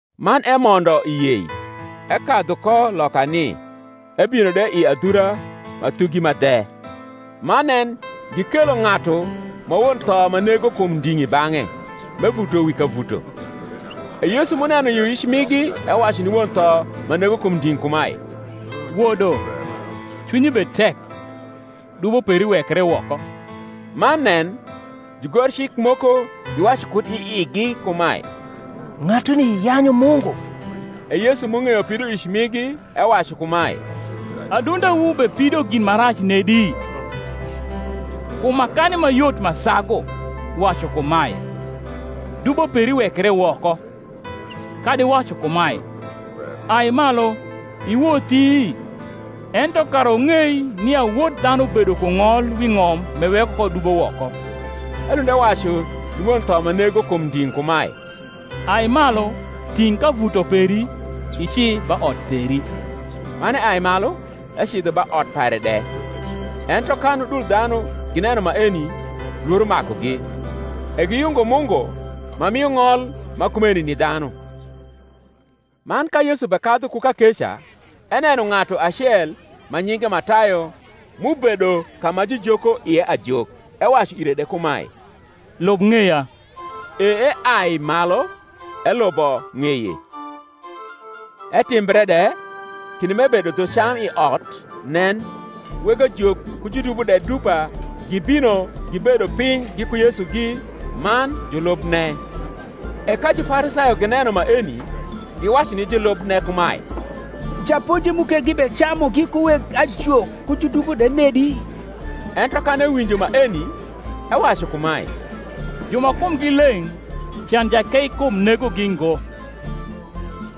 Man emondo i yei, ekadhu ko lokani, ebino de i adhura ma thugi ma dhe. Man nen, gikelo ng’atu ma won tho ma nego kum nding’ i bang’e, m’evuto wi kavuto: e Yesu m’uneno yioyic migi ewacu ni won tho ma nego kum nding’ kumae, Wodo, cwinyi bed tek: dubo peri wekre woko. Man nen, jugorcik moko giwacu kud i igi kumae, Ng’atuni yanyu Mungu. E Yesu m’ung’eyo pidoic migi ewacu kumae, Adundewu bepido gin ma rac nedi? Kum makani ma yot ma sagu, wacu kumae, Dubo peri wekre woko; kadi wacu kumae, Ai malu, iwothi? Ento kara wung’ei nia Wod dhanu bedo ku ng’ol wi ng’om m’eweko ko dubo woko (elund ewacu ni won tho ma nego kum nding’ kumae), Ai malu, ting’ kavuto peri, ici ba ot peri. Man eai malu, ecidho ba ot pare de. Ento kan udul dhanu gineno maeni, lworo makugi, e giyungo Mungu, ma mio ng’ol ma kumeni ni dhanu. Man ka Yesu bekadhu ku kakeca, eneno ng’atu acel, ma nyinge Matayo, m’ubedo ka ma jujoko ie ajok: ewacu ire de kumae, Lub ng’eya. E eai malu, elubo ng’eye. Etimbre de, kinde m’ebedo dhu cam i ot, nen, weg ajok ku judubo de dupa gibino gibedo piny giku Yesugi man julubne. E ka Jufarisayo gineno maeni, giwacu ni julubne kumae, Japonji mu ke gibecamu giku weg ajok ku judubo de nedi? Ento kan ewinjo maeni, ewacu kumae, Ju ma kumgi leng’ can jakeikum negogi ngo,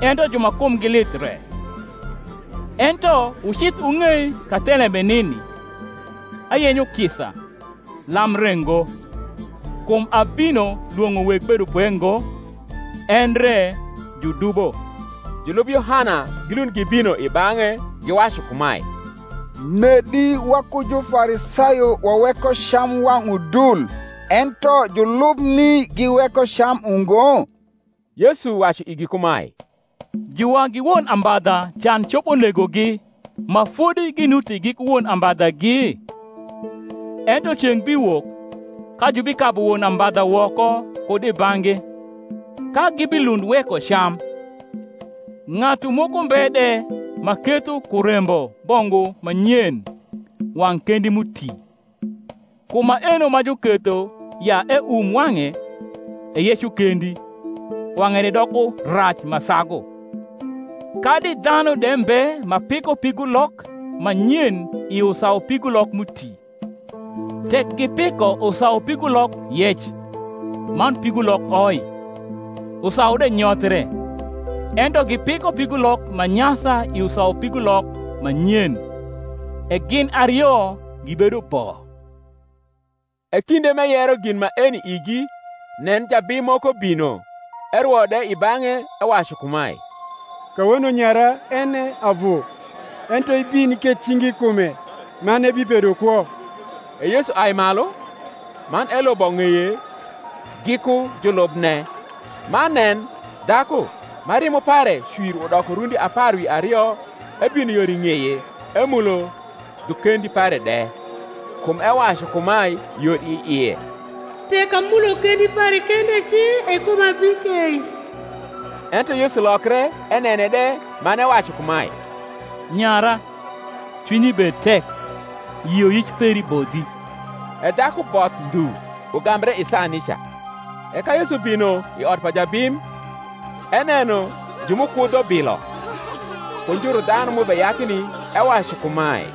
ento ju ma kumgi lith re. Ento wucidh wung’ei ka thelembe nini, ayenyo kisa, lam re ngo: kum abino lwong’o weg bedopwe ngo, endre judubo. Julub Yohana gilund gibino i bang’e, giwacu kumae, Nedi waku Jufarisayo waweko cam wang’ udul, ento julubni giweko cam ungo? Yesu wacu igi kumae, Juwagi won ambadha can copo negogi, ma fodi ginuti giku won ambadhagi? ento ceng’ biwok, ka jubikabu won ambadha woko kud i bang’gi, ka gibilund weko cam. Ng’atu moko mbe de ma ketho kurembo bongu ma nyen wang’ kendi m’uti; kum maeno ma juketho ya eum wang’e, eyeco kendi, wang’e de doko rac ma sagu. Kadi dhanu de mbe ma piko pigulok ma nyen i usaupigulok m’uti: tek gipiko usaupigulok yec, man pigulok oi, usau de nyothie: ento gipiko pigulok ma nyasa i usaupigulok ma nyen, e gin ario gibedo bo. E kinde m’eyero gin maeni igi, nen, jabim moko bino, erwo de i bang’e, ewacu kumae, Kawono nyara en e avu: ento ibin iketh cingi i kume, man ebibedo kwo. E Yesu ai malu, man elubo ng’eye, giku julubne. Man nen, dhaku, ma rimo pare cwir udoko rundi apar wi ario, ebino yor i ng’eye, emulo dhu kendi pare de: kum ewacu kumae yor i ie, Tek amulo kendi pare kende ci, e kuma bikei. Ento Yesu lokre enene de man ewacu kumae, Nyara, cwinyi bed tek; yioyic peri bodhi. E dhaku both ndhu ugambre i saa nica. E ka Yesu bino i ot pa jabim, eneno ju m’ukudho bilo, ku njuru dhanu m’ubeyakni, ewacu kumae,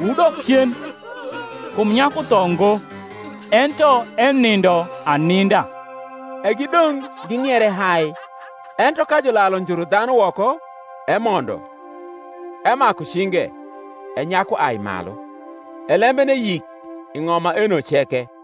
wudok cen: kum nyaku tho ngo, ento enindo aninda. E gidong’ ging’iere hai. Ento ka julalu njuru dhanu woko, emondo, emaku cinge; e nyaku ai malu. E lembene yik i ng’om maeno ceke.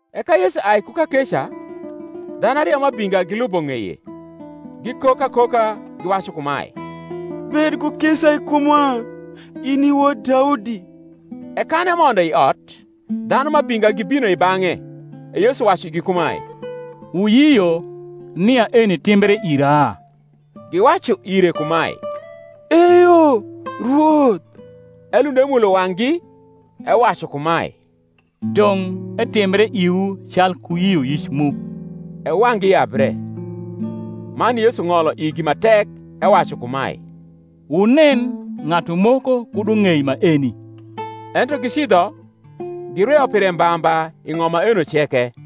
E ka Yesu ai ku kakeca, dhanu ario m’abinga gilubo ng’eye, gikok akoka, giwacu kumae, Bed ku kisa i kumwa, in i wod Daudi. E kan emondo i ot, dhanu m’abinga gibino i bang’e: e Yesu wacu igi kumae, Wuyio nia eni timbre ira? Giwacu ire kumae, Eyo, Rwoth. Elund emulo wang’gi, ewacu kumae, Dong’ etimbre iwu calku yioyic mu. E wang’gi yabre. Man Yesu ng’olo igi ma tek, ewacu kumae, Wunen ng’atu moko kud ung’ei maeni. Ento gicidho, girweyo pire mba mba i ng’om maeno ceke.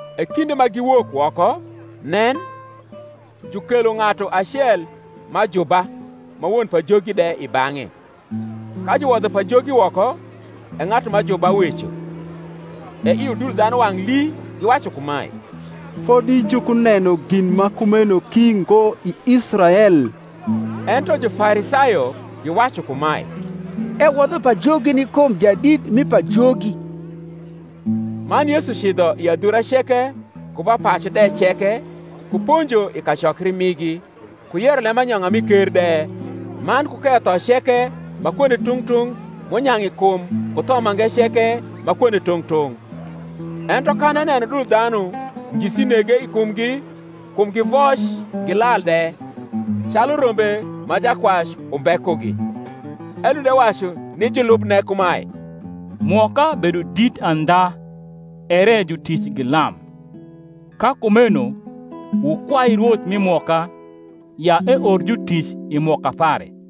E kinde ma giwok woko, nen, jukelo ng’atu acel m’ajuba ma won pajogi de i bang’e. Ka juwodho pajogi woko, e ng’atu m’ajuba weco: e i udul dhanu wang’ lii, giwacu kumae, Fodi jukuneno gin ma kumeno ki ngo i Israel. Ento Jufarisayo giwacu kumae, Ewodho pajogi ni kum jadit mi pajogi. Man Yesu cidho i adhura ceke ku ba pacu de ceke, ku ponjo i kacokri migi, ku yero lembanyong’a mi ker de, man ku keyo rno ceke ma kwonde tung’ tung’ m’unyang’ i kum ku tho mange ceke ma kwonde tung’ tung’. Ento kan eneno udul dhanu, ngisi nege i kumgi, kum givoc gilal de, calu rombe ma jakwac umbe kugi. Elund ewacu ni julubne kumae, Mwoka bedo dit andha ere jutic gi lam. Ka kumeno wukwai Rwoth mi mwoka, ya eor jutic i mwoka pare.